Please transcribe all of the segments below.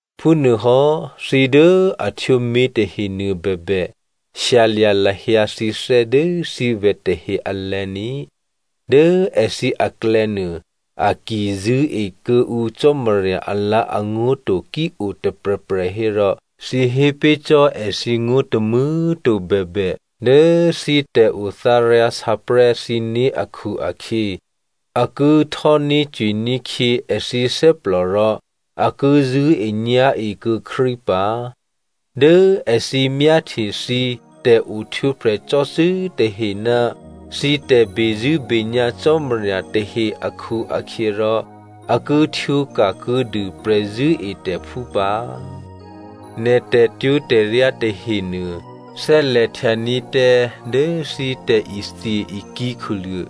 Phúnuôhò́ thǐ dố a htwǒ mětahe nuôbèbè, shyalya̤ lahyǎ thǐthè́ dố thǐvè̤ tahe alè̤̌ ní꤮. Dố èthǐ aklè̌nuô, a ki zṳ̂́e kuô̌ǔ Cò́marya alǎ̤angó̤ to ki-o tôprè̤prè̤ hérò, thǐ hé pé̤ cò́ èthǐ ngó̤ tômû̌꤮ to bèbè, dố thǐ tè̤othǎryǎsǎprè̤́ thǐné̤ akhu-akhyě a ki htò́ní̤cwiní̤ khyě èthǐ thè́plò rò a ki zṳ̂́enyá̤e kuô̌ Krístu pǎ. Dố èthǐ myáhtye thǐ tè̤ohtwǒprè̤ cò́cû́ tahe ná thǐ tè̤bezṳ̂́benyá̤ Cò́marya tahe akhu-akhyěrò, a ki htwǒka̤ kuô̌dû prè̤zṳ̂́etè̤phú pǎ. Nè̤ tè̤twó̤tè̤ryá tahenuô thè́lè̤htyaní̤ tǎ dố thǐ tè̤ithye-ikǐ̤ khuluô̤,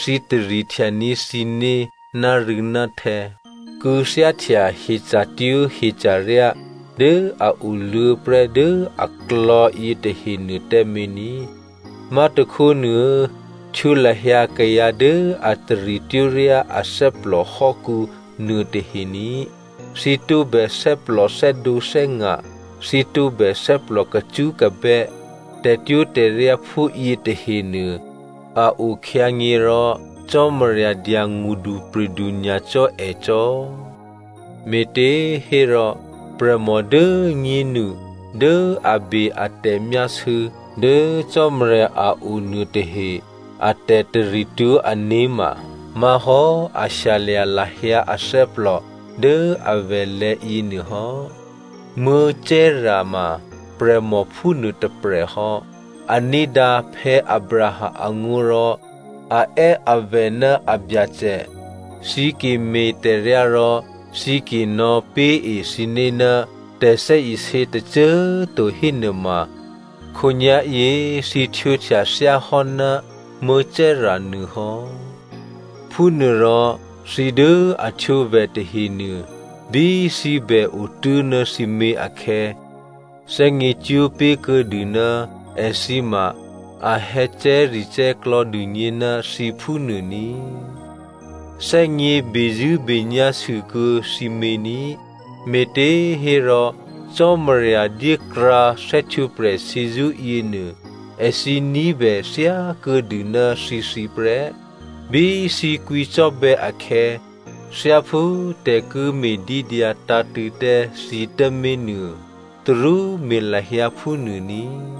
thǐ tarihtyaní̤ thǐné̤ nárû̌náhtè̌, kû̌thyáhtya hyeca̤twó̤ hyeca̤ryá dố a oluô̌ prè́ dố aklò̌ yětahenuô tǎmé̤ ní. Má̤tôkhónuô, htwǒ lahyǎ kayǎ dố a taritwó̤ryá athè́plò hò́kǔ nuôtahe ní꤮. Thǐ tǒbè thè́plò thè́dǒthè́nga̤, thǐ tǒbè thè́plò kacṳ́kabè́. Tè̤twó̤tè̤ryá phúyě tahenuô, a okhyǎnyě̤ rò Cò́marya dya ngṳdupri̤du nyacò́ ècò́. Me̤těhérò prè̤mò dố꤮ nyénu dố a be a tè̤myásû̌ dố Cò́marya a o nuôtahe a tè̤taritwó̤ ané̤ ma má̤hò́ a shyalya̤ lahyǎ athè́plò dố avè̤lè̤̌ yěnuô hò́. Sara ma prè̤mò phúnuô tôprè̤ hò́. A ní̤dǎ Abraham angó̤ rò a è́ avè̤ ná abyacè. Thǐ ki me̤tè̤ryá rò thǐ ki nò̌pé̤e thǐné̤ ná tè̤thè́isě tôcô꤮ to hénuôma, khǒnyá̤yě thǐ htwǒhtya thyáhò́ ná Sara nuô hò́. Phúnuôrò thǐ dố a htwǒ vè̤ tahenuô, bí thǐ bè otố̤ ná thǐmě akhè̌, thè́gně cwó̤ pé̤ kuô̌dû ná èthǐ ma a hè̌cè̤́recè̤́ klò̌dûgně ná thǐ phúnuô ní꤮. Thè́gně bezṳ̂́benyá̤ sûkuô̌ thǐmě ní꤮. Me̤těhérò Cò́marya dyékrǎ thè́htwǒprè̤ shyězṳ́ yěnuô, èthǐ ní̤bè thyákuô̌dû ná thǐthǐ prè́. Bí thǐ kwǐcò́bè̌ akhè̌, thyáphú tè̤ ki me̤dídyǎ tǎ̤tṳ̂̌ tǎ thǐ tǎmé̤ nuô, tarú me̤ lahyǎ phúnuô ní꤮.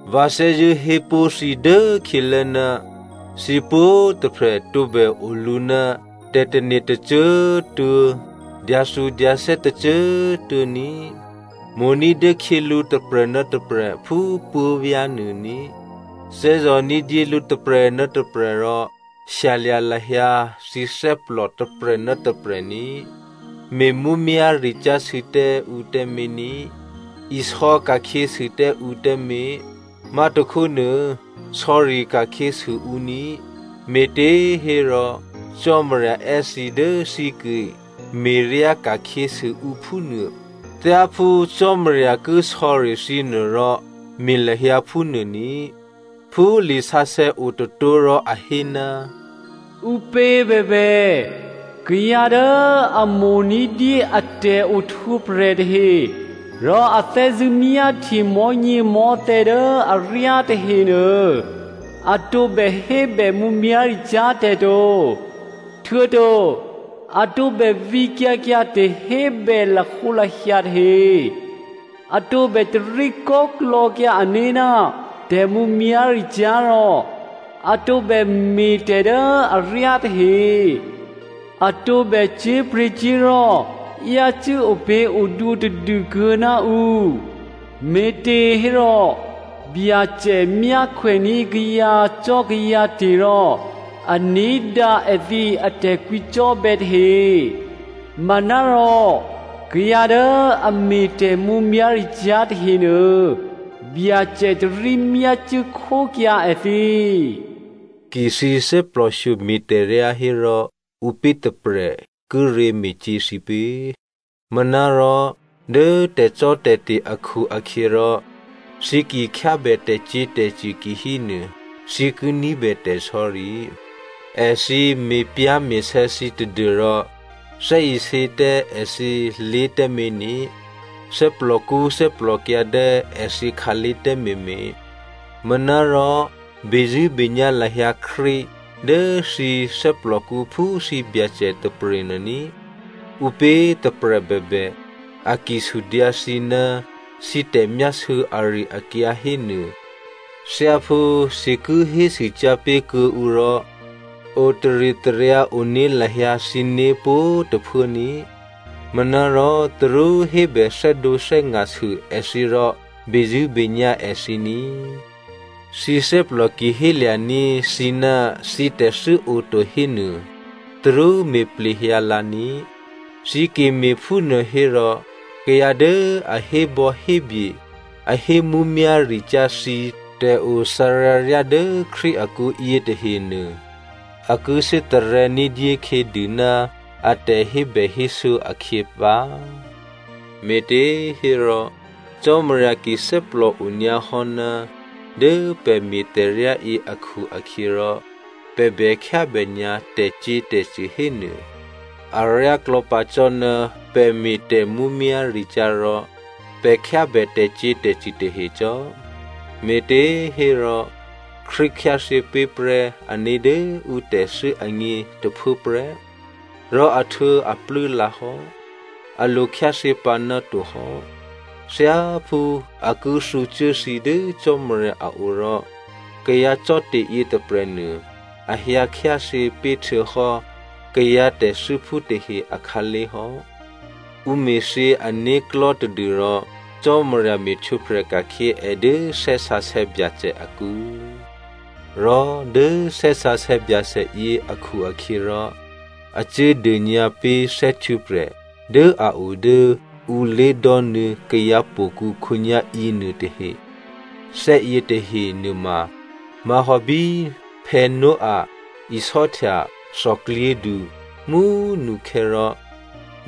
Vǎ thè́zṳ̂́ hé pó̤ thǐ dốkhyělố, thǐ pwǒ̤꤮ tôprè̤ tǒbè olǔ ná tè̤tane̤ tôcô꤮ tuô̌, tè̤dyathudyathè́ tôcô꤮ tuô̌ ní꤮. Mo̤ ní̤dyé khyělǔ tôprè̤ ná tôprè̤ phú puố̤vyá̤ nuô ní꤮. Thè́zò̤ ní̤dyé lǔ tôprè̤ ná tôprè̤ rò shyalya̤ lahyǎ thǐ thè́plò tôprè̤ ná tôprè̤ ní꤮. Me̤mǔmyá̤ricyá̤ sû tǎ ǔ tǎmé̤ ní꤮, isò̌ ka̤khyě sû tǎ ǔ tǎmé̤, má̤tôkhónuô sò̌ri ka̤khyě sû ǔ ní꤮. Me̤těhérò Cò́marya è́ thǐ dố thǐ ki me̤ryá ka̤khyěsû ǔ phúnuô. Thyáphú Cò́marya ki sò̌ri thǐ nuô rò me̤ lahyǎ phúnuô ní꤮. Phú lisǎsè̌ otôtó̤ rò a hé, “Ǔpě bèbè, kayǎ dố a mo̤ ní̤dyé a tè̤ohtwǒprè̤ tahe rò a thè́zṳ̂́ myáhtye mò̤́nyěmò̤́thè̌ dố aryá tahenuô, a tǒbè hébè mǔmyá̤ricyá̤ tè̤ to. Htuô̌to a tǒbè vǐkyǎ kyǎ tè̤hébè lahǒlahya tahe. A tǒbè taríkò́klò̌kyǎ ané̤ ná tè̤mǔmyá̤ricyá̤ rò a tǒbè me̤tè̤ dố aryá tahe. A tǒbè cyé̤pryě̤cyé̤li̤ yácû́ opě̤odwǒ tadû kuô̌ ná ǔ. Me̤těhérò, Byacè myákhwèní̤ kayǎcò́kayǎte̤ rò a ní̤dǎ èthǐ atè̤kwǐcò́bè̌ tahe. Manárò kayǎ dố a me̤ tè̤mǔmyá̤ricyá̤ tahenuô, Byacè tarí myácuốkhókyǎ èthǐ.” Ki thǐ thè́plòshyo me̤tè̤ryá hérò ǔpě tôprè̤ kíré̤ me̤cyě̤ thǐ pě? Manárò dố tè̤cò́tè̤te̤ akhu-akhyěrò thǐ ki khyábè tè̤cyě̤tè̤cṳ̂ kihénuô, thǐ ki ní̤bè tè̤sò̌ri. Èthǐ me̤pyá̤me̤sè̌ thǐ tadû́rò thè́isě tǎ èthǐlé̤ tǎmé̤ ní꤮, thè́plòkṳ́ thè́plòkyǎ̤ tǎ èthǐ khǎlé̤ tǎmé̤mé̤. Manárò, bezṳ̂́benyá̤ lahyǎ Krístu dố thǐ thè́plòkǔ phú thǐ Byacè tôprè̤nuô ní꤮. Ǔpě tôprè̤ bèbè, a ki sudyǎ thǐ ná thǐ tè̤myásû̌ ari-akyǎ hénuô, thyáphú thǐ ki hésûcyá̤ pé̤ kuô̌ǔ rò otaritaryǎ one lahyǎ thǐné̤ pwǒ̤꤮ tôphuố ní꤮. Manárò tarú hébè thè́dǒthè́nga̤ sû èthǐ rò bezṳ̂́benyá̤ èthǐ ní꤮. Thǐ thè́plò ki hélya̤ní̤ thǐ ná thǐtè̤thû́ oto hénuô, tarú me̤ plehyǎ lǎ ní꤮. Thǐ ki me̤phúnuô hérò kayǎ dố a hébò̌hébye, a hé mǔmyá̤ricyá̤ thǐ tè̤othǎryǎ ryá dố Krístu akǔ yětahenuô, a ki thè́tarè̤̌ ní̤dyé khyědû ná a tè̤hébèhésû̌ akhyě pǎ. Me̤těhérò Cò́marya ki thè́plòo nyǎhò́, dố pè̤ me̤tè̤ryáyě akhu-akhyěrò, pè̤ bè khyábè nyǎ tè̤cyě̤tè̤cṳ̂ hénuô, aryáklò̌ pǎ cò́ ná pè̤ me̤ tè̤mǔmyá̤ricyá̤ rò pè̤ khyábè tè̤cyě̤tè̤cṳ̂ tahe cò́. Me̤těhérò Krístu khyáthyě pé̤ prè́ ané̤ dố ǔ tè̤thû́ agně tôphuốprè́ rò ahtuô̌aplû́ lǎ hò́, a lo khyáthyě pǎnáto hò́. Thyáphú a ki thǔcuố thǐ dố Cò́marya a o rò kayǎ cò́te̤ yětôprè̤nuô a hyǎ khyáthyě pé̤htuô̌hò́ kayǎ tè̤thû́phú tahe akhǎlé̤ hò́, ǔ me̤thyě ané̤klò̤́ tadû́rò Cò́marya me̤htwǒprè̤ ka̤khyě è dố Thè́ Sǎsè̌ Byacè akǔ. Rò dố Thè́ Sǎsè̌ Byacè yě akhu-akhyěrò, a cuố dônyǎ pé̤ thè́htwǒprè̤ dố a o dố ǔ lé̤dò́nuô̌ kayǎhtò̌kǔ khǒnyá̤ yěnuô tahe. Thè́ yětahe nuôma má̤hò́ bí Noah isò́htya thòklyědu mú꤮ nukhè̌ rò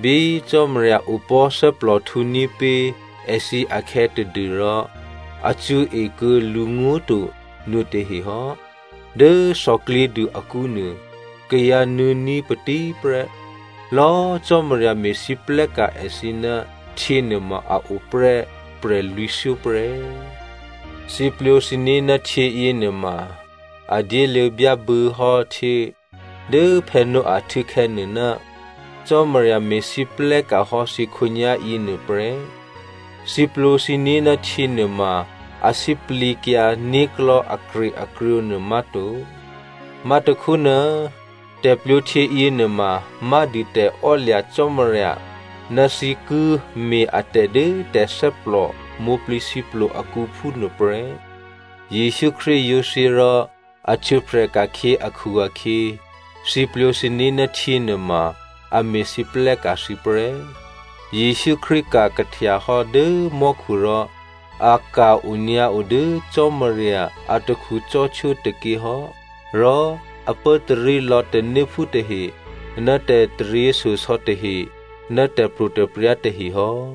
bí Cò́marya opò̤́ thè́plòhtǔní̤ pé̤ èthǐ akhè̌ tadû́rò a cṳ̌e kuô̌ lǔngó̤ to nuôtahe hò́. Dố thòklyědu akǔnuô kayǎ nuô̌ní̤ patí prè́. Lò̌꤮ Cò́marya me̤lwóhteka̤ èthǐ ná htyě nuôma a o prè́ prè̤lwǐ̤thyó prè́. Thǐ plwǒ thǐné̤ ná htyě yěnuôma, a dyéluô̌ byábû̌ hò́ htyě dố Noah htû̌khè̌ nuô, Cò́marya me̤lwóhteka̤ hò́ thǐ khǒnyá̤yě nuôprè́. Thǐ plwǒ thǐné̤ ná htyě nuôma a sǐplǐkyǎ né̤klò̤́ akrye-akrǒ nuô má̤to. Má̤tôkhónuô, tè̤plwǒhtyě yěnuôma má̤dû tè̤ò́lya̤ Cò́marya ná thǐ ki me̤ atè̤ dố tè̤thè́plò mwǒ̤plǐthǐplo akǔ phúnuôprè́. Jesǔ Krístu yǒ thyě rò a htwǒprè̤ ka̤khyě akhu-akhyě, thǐ plwǒ thǐné̤ ná htyě nuôma a me̤lwóhteka̤ thǐ prè́. Jesǔ Krístu ka̤ kahtyahò́ dố mò́khu rò a ka̤ onyǎo dố Cò́marya atakhu cò́htwó tôkyě hò́, rò a pốtarí lò̌ tanéphú tahe ná tè̤taryěshyosò̌ tahe, ná tè̤pro̤tè̤prya̤ tahe hò́.